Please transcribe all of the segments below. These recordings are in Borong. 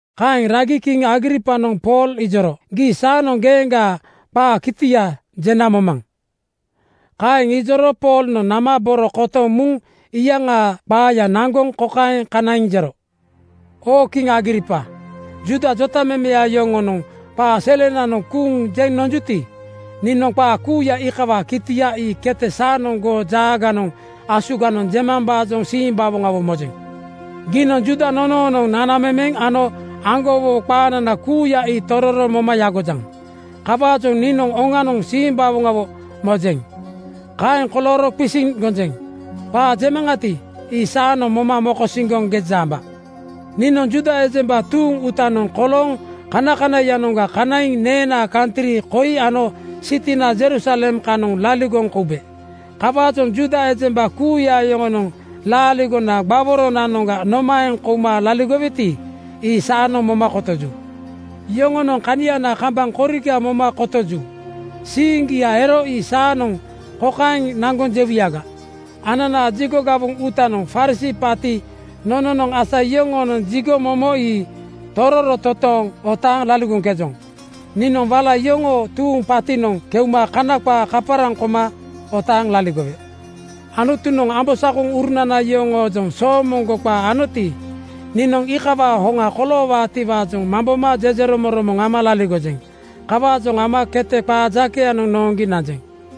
Kaeŋ ragi kiŋ Agripanoŋ Pool ijoro, “Gii saanoŋ geeŋgaa qaa kitia jena momaŋ.” Kaeŋ ijoro Poolnoŋ nama boro kotoŋ muŋ iyaŋaa qaaya naŋgoŋ kokaeŋ kanaiŋ jero, “Oo kiŋ Agripa, Juuda jotamemeya yoŋonoŋ qaa selenanoŋ kuuŋ jeŋ nonjuti, niinoŋ qaa kuuya iikawaa kitia ii kete saanoŋ goo jaaganoŋ asuganoŋ jemambaajoŋ simbawoŋawo mojeŋ. Giinoŋ Juuda nonoonoŋ nanamemeŋ ano aŋgowowo qaanana kuuya ii tororo moma yagojaŋ. Kawaajoŋ niinoŋ oŋanoŋ simbawoŋawo mojeŋ. Kaeŋ kolooro qisiŋ gonjeŋ: Qaa jemaŋati, ii saanoŋ moma mokosiŋgoŋ geja amba. “Niinoŋ Juuda ejemba tuuŋ uutanoŋ kolooŋ kanakanaiyanoŋga kanaiŋ neenaa kantri koi ano sitinana Jerusalem kanoŋ laligoŋ koube. Kawaajoŋ Juuda ejemba kuuya yoŋonoŋ laaligona gbaworonanoŋga nomaeŋ kouma laligoweti, ii saanoŋ moma kotoju. Yoŋonoŋ kaniana kambaŋ koriga moma kotoju. Siiŋgia ero ii saanoŋ kokaeŋ naŋgoŋ jewuyaga: Ananaa jigo gawoŋ uutanoŋ Farisii paati nononoŋ asa yoŋoonoŋ jigo momo ii tororo toontooŋ otaaŋ laligoŋkejoŋ. Niinoŋ wala yoŋoo tuuŋ paatinoŋ keuma Kana qaa kaparaŋ koma otaaŋ laligowe. Anutunoŋ ambosakoŋurunana yoŋoojoŋ soomoŋgo qaa anoti, niinoŋ iikawaa hoŋa koloowaatiwaajoŋ mamboma jejeromoŋromoŋ ama laligojeŋ. Kawaajoŋ ama kete qaa jakeyanoŋ nooŋgi nanjeŋ.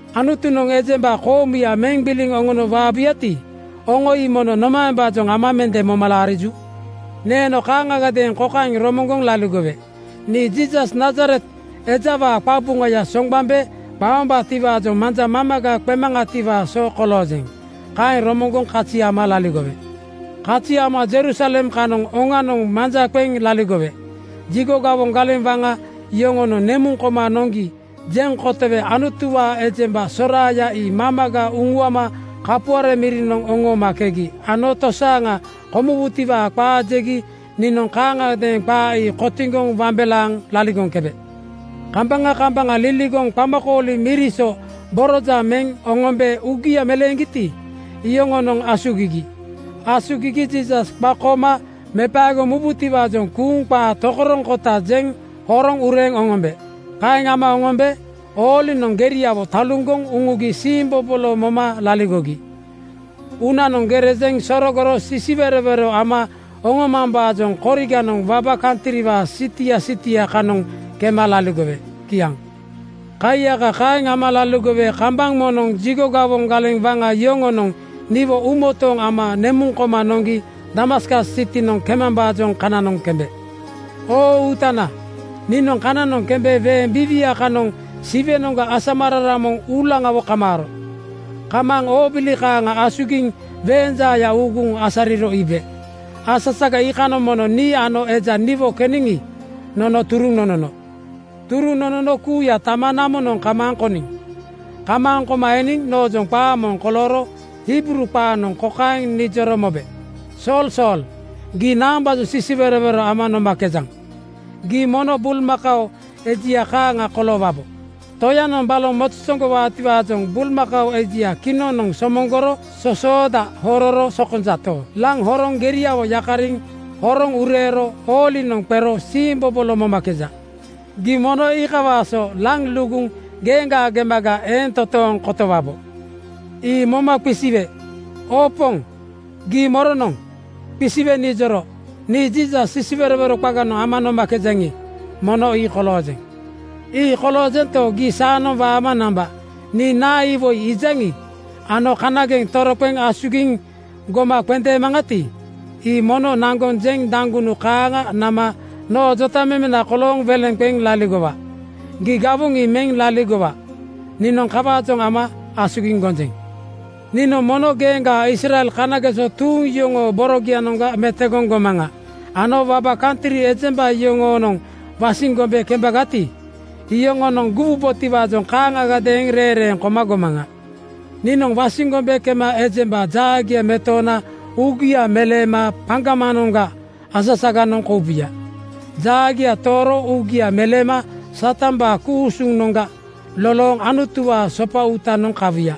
Anutunoŋ ejemba koomuya meŋ gbiliŋ oŋono waabuyati, oŋo ii mono nomaembaajoŋ ama mende moma laariju? “Neeno kaaŋagadeeŋ kokaeŋ romoŋgoŋ laligowe, ‘Nii Jiisas Nazaret ejawaa qabuŋaya soŋgbambe qaombaatiwaajoŋ manja mamaga qemaŋatiwaa so koloojeŋ’ Kaeŋ romoŋgoŋ kazi ama laligowe. Kazi ama Jerusalem kanoŋ oŋanoŋ manja qeŋ laligowe. Jigo gawoŋ galeŋ waŋa yoŋonoŋ nemuŋ koma noŋgi jeŋ kotowe Anutuwaa ejemba soraaya ii mamaga uŋuama kapuare mirinoŋ oŋoomakegi ano tosaaŋa komuwutiwaa qaa jegi niinoŋ kaaŋagadeeŋ qaa ii kotiŋgoŋ wambelaaŋ (wout ama) laligoŋkebe. Kambaŋa kambaŋa liligoŋ qamakooli miri so borojaŋ meŋ oŋombe uugia meleeŋgiti, iyoŋonoŋ asugigi. Asugigi Jiisas qakooma mepaegoŋ mubutiwaajoŋ kuuŋ qaa tokoroŋkota jeŋ horoŋ ureeŋ oŋombe. Kaeŋ ama oŋombe oolinoŋ geriawo taluŋgoŋ uŋugi siimbobolo moma laligogi. Uunanoŋ gere jeŋ sorogoro sisiwerowero ama oŋomambaajoŋ koriganoŋ waba kantriwaa sitia sitia kanoŋ kema laligowe.” Kiaŋ. “Kaiyaka kaeŋ ama laligowe kambaŋ moŋnoŋ jigo gawoŋ galeŋ waŋa yoŋonoŋ niwo uumotooŋ ama nemuŋ koma noŋgi Damaskas sitinoŋ kemambaajoŋ kananoŋ kembe. Oo Uutana, niinoŋ kananoŋ kembe weeŋ biiwia kanoŋ Siwenoŋga asamararaŋ moŋ uulaŋawo kamaaro. Kamaaŋ oobili kaaŋa asugiŋ weeŋ jaaya uuguŋ asariro iibe. Asasaga iikanoŋ mono nii ano eja niwo keniŋi, nono turuŋ nonono. Turuŋ nonono kuuya tama namonoŋ kamaaŋ koniŋ. Kamaaŋ koma eniŋ noojoŋ qaa moŋ kolooro Hibruu qaanoŋ kokaeŋ nijoro mobe, ‘Sool, Sool, gii naambaajoŋ sisiwerowero ama nomakejaŋ? Gii mono bulmakao ejia kaaŋa koloowabo. Toyanoŋ baloŋ mozozoŋgowaatiwaajoŋ bulmakao ejia kinoŋnoŋ somoŋgoro sosooda hororo sokonjato, laŋ horoŋ geriawo yakariŋ horoŋ ureero oolinoŋ qero siimbobolo momakeja. Gii mono iikawaa so laŋ luguŋ geeŋgaa gemaga eeŋ toontooŋ kotowabo.’ “Ii moma qisiwe, ‘Oo Poŋ, gii moronoŋ?’ Qisiwe nijoro, ‘Nii Jiisas sisiwerowero qaganoŋ ama nomakejaŋi, mono ii koloojeŋ. Ii koloojento, gii saanoŋ waama namba. Nii ano iwoi iijaŋi ano kanageŋ toroqeŋ asugiŋ goma qendeemaŋati, ii mono naŋgoŋ jeŋ daŋgunu kaaŋa nama noo jotamemena kolooŋ welena qeŋ laligowa. Gii gawoŋ ii meŋ laligowa. Niinoŋ kawaajoŋ ama asugiŋ gonjeŋ. Niinoŋ mono geeŋgaa Israel kanageso tuuŋ yoŋoo borogianoŋga metogoŋ gomaŋa ano waba kantri ejemba yoŋoonoŋ wasiŋ gombe kembagati, iyoŋonoŋ guwubotiwaajoŋ kaaŋagadeeŋ reeŋreeŋ koma gomaŋa. Niinoŋ wasiŋ gombe kema ejemba jaagia metoona uugia meleema paŋgamanoŋga asasaganoŋ koubuya. Jaagia tooro uugia meleema Satambaa ku-usunoŋga lolooŋ Anutuwaa sopa uutanoŋ kawuya.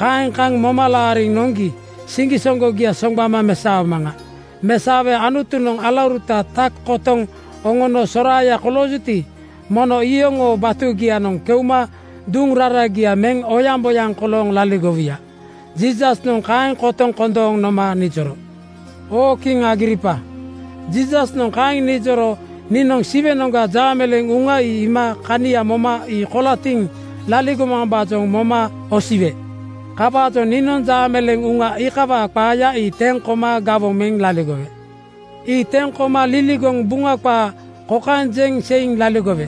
Kaeŋ kaŋ moma laariŋ noŋgi siŋgisoŋgogia soŋgbama mesaomaŋa. Mesaowe Anutunoŋ alauruta tak kotoŋ oŋono soraaya koloojuti, mono iyoŋoo batugianoŋ keuma duŋ raragia meŋ oyaŋboyaŋ kolooŋ laligowuya.’ Jiisasnoŋ kaeŋ kotoŋ kondooŋ noma nijoro.” “Oo kiŋ Agripa, Jiisasnoŋ kaeŋ nijoro niinoŋ Siwenoŋga jaameleeŋ uŋa iima kania moma ii kolatiŋ laligomambaajoŋ moma osiwe. Kawaajoŋ niinoŋ jaameleeŋ uŋa iikawaa qaaya ii teŋ koma gawoŋ meŋ laligowe. Ii teŋ koma liligoŋ Buŋa qaa kokaeŋ jeŋ seiŋ laligowe: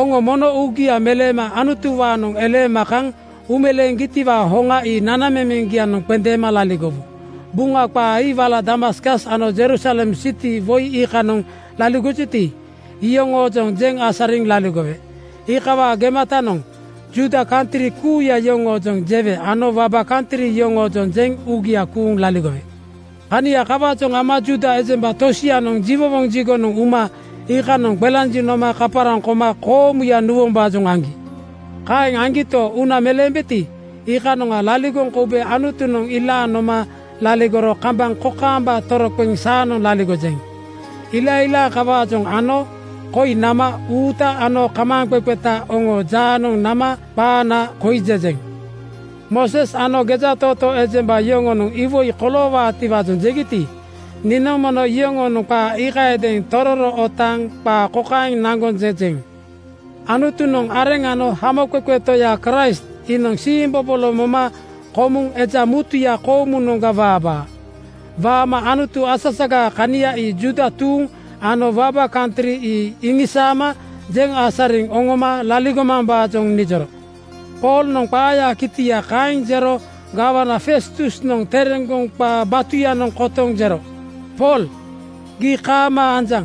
Oŋo mono uugia meleema Anutuwaanoŋ eleema kaŋ uumeleeŋgitiwaa hoŋa ii nanamemeŋgianoŋ qendeema laligowu. Buŋa qaa ii wala Damaskas ano Jerusalem siti woi iikanoŋ laligojuti, iyoŋoojoŋ jeŋ asariŋ laligowe. Iikawaa gematanoŋ Juuda kantri kuuya yoŋoojoŋ jewe ano waba kantri yoŋoojoŋ jeŋ uugia kuuŋ laligowe. Kania kawaajoŋ ama Juuda ejemba tosianoŋ jiwowoŋ jigonoŋ uma iikanoŋ qelanjiŋ noma kaparaŋ koma koomuya nuwombaajoŋ aŋgi. “Kaeŋ aŋgito, uuna meleembeti, iikanoŋa laligoŋ koube Anutunoŋ ilaaŋ noma laligoro kambaŋ kokaamba toroqeŋ saanoŋ laligojeŋ. Ilailaaŋ kawaajoŋ ano koi nama uuta ano kamaaŋqeqeta oŋoo jaanoŋ nama qaana koi jejeŋ. Mooses ano gejatootoo ejemba yoŋonoŋ iwoi koloowaatiwaajoŋ jegiti, niinoŋ mono yoŋoonoŋ qaa iikayadeeŋ tororo otaaŋ qaa kokaeŋ naŋgoŋ jejeŋ: Anutunoŋ areŋ ano Hamoqeqe Toya Kraist iinoŋ siimbobolo moma komuŋ eja mutuya koomunoŋga waabaa. Waama Anutu asasagaa kania ii Juuda tuuŋ ano waba kantri ii iŋisaama jeŋ asariŋ oŋoma laligomambaajoŋ nijoro.” Poolnoŋ qaayaa kitia kaeŋ jero gawana Festusnoŋ tereŋgoŋ qaa batuyanoŋ kotoŋ jero, “Pool, gii kaamaa anjaŋ.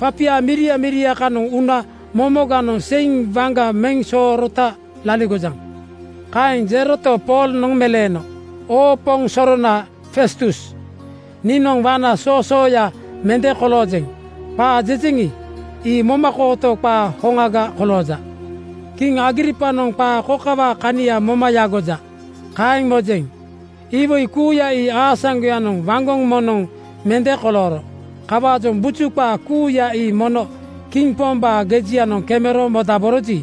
Papia miria miria kanoŋ una momoganoŋ seiŋ waŋga meŋ soorota laligojaŋ.” Kaeŋ jeroto, Poolnoŋ meleeno, “Oo poŋ sorona Festus, niinoŋ waŋna soosooya mende koloojeŋ. Qaa jejeŋi, ii momakooto qaa hoŋaga kolooja. Kiŋ Agripanoŋ qaa kokawaa kania moma yagoja, kaeŋ mojeŋ. Iwoi kuuya ii aasaŋgoyanoŋ waŋgoŋ moŋnoŋ mende kolooro. Kawaajoŋ buju qaa kuuya ii mono kiŋ pombaa gejianoŋ kemero modaboroji,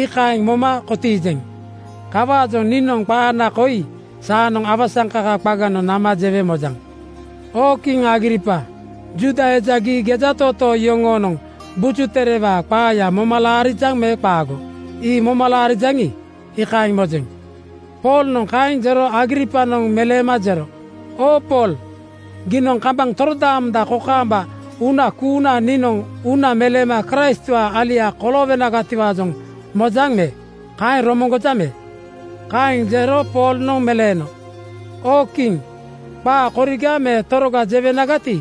iikaeŋ moma kotiijeŋ. Kawaajoŋ niinoŋ qaana koi saanoŋ awasaŋkaka qaganoŋ nama jewe mojaŋ. Oo kiŋ Agripa, Juuda eja gii gejatootoo yoŋoonoŋ Buju Terewaa qaaya moma laarijaŋ me qaago? Ii moma laarijaŋi, iikaeŋ mojeŋ.” Poolnoŋ kaeŋ jero Agripanoŋ meleema jero, “Oo Pool, giinoŋ kambaŋ torodaamoŋ kokaamba uuna kuuna niinoŋ uuna meleema Kraistwaa alia koloowenagatiwaajoŋ mojaŋ me? Kaeŋ romoŋgojaŋ me?” Kaeŋ jero Poolnoŋ meleeno, “Oo kiŋ, qaa koriga me toroga jewenagati,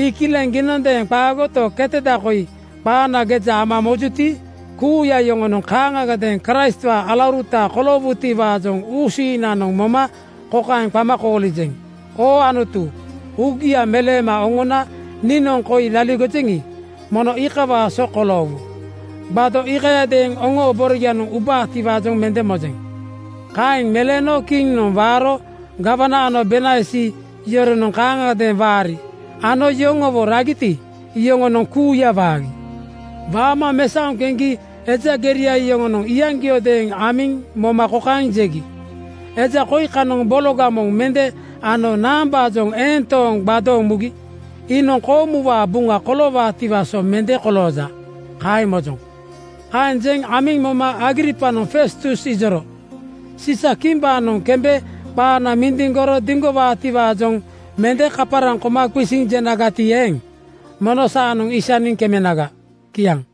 ii kileŋ. Giinondeeŋ qaagoto, keteda koi qaana geja ama mojuti, kuuya oŋonoŋ kaaŋagadeeŋ Kraistwaa alauruta koloowutiwaajoŋ uusiiŋnanoŋ moma kokaeŋ qama koolijeŋ: Oo Anutu, uugia meleema oŋona niinoŋ koi laligojeŋi, mono iikawaa so koloowu. Gbado (tape) iikayadeeŋ oŋoo borogianoŋ ubaatiwaajoŋ mende mojeŋ.” Kaeŋ meleeno kiŋnoŋ waaro gawana ano Bernaisi yoronoŋ kaaŋagadeeŋ waari ano yoŋowo ragiti, iyoŋonoŋ kuuya waagi. Waama mesaoŋ keŋgi eja geria yoŋonoŋ iyaŋgiodeeŋ amiŋ moma kokaeŋ jegi, “Eja koi kanoŋ bologa moŋ mende ano naambaajoŋ eeŋ tooŋ gbadooŋ mugi? Iinoŋ koomuwaa buŋa koloowaatiwaa so mende kolooja, kaeŋ mojoŋ.” Kaeŋ jeŋ amiŋ moma Agripanoŋ Festus ijoro, “Siisakimbaanoŋ kembe qaana mindiŋgoro diŋgowaatiwaajoŋ mende kaparaŋ koma qisiŋ jenagati eeŋ, mono saanoŋ isaniŋ kemenaga.” Kiaŋ.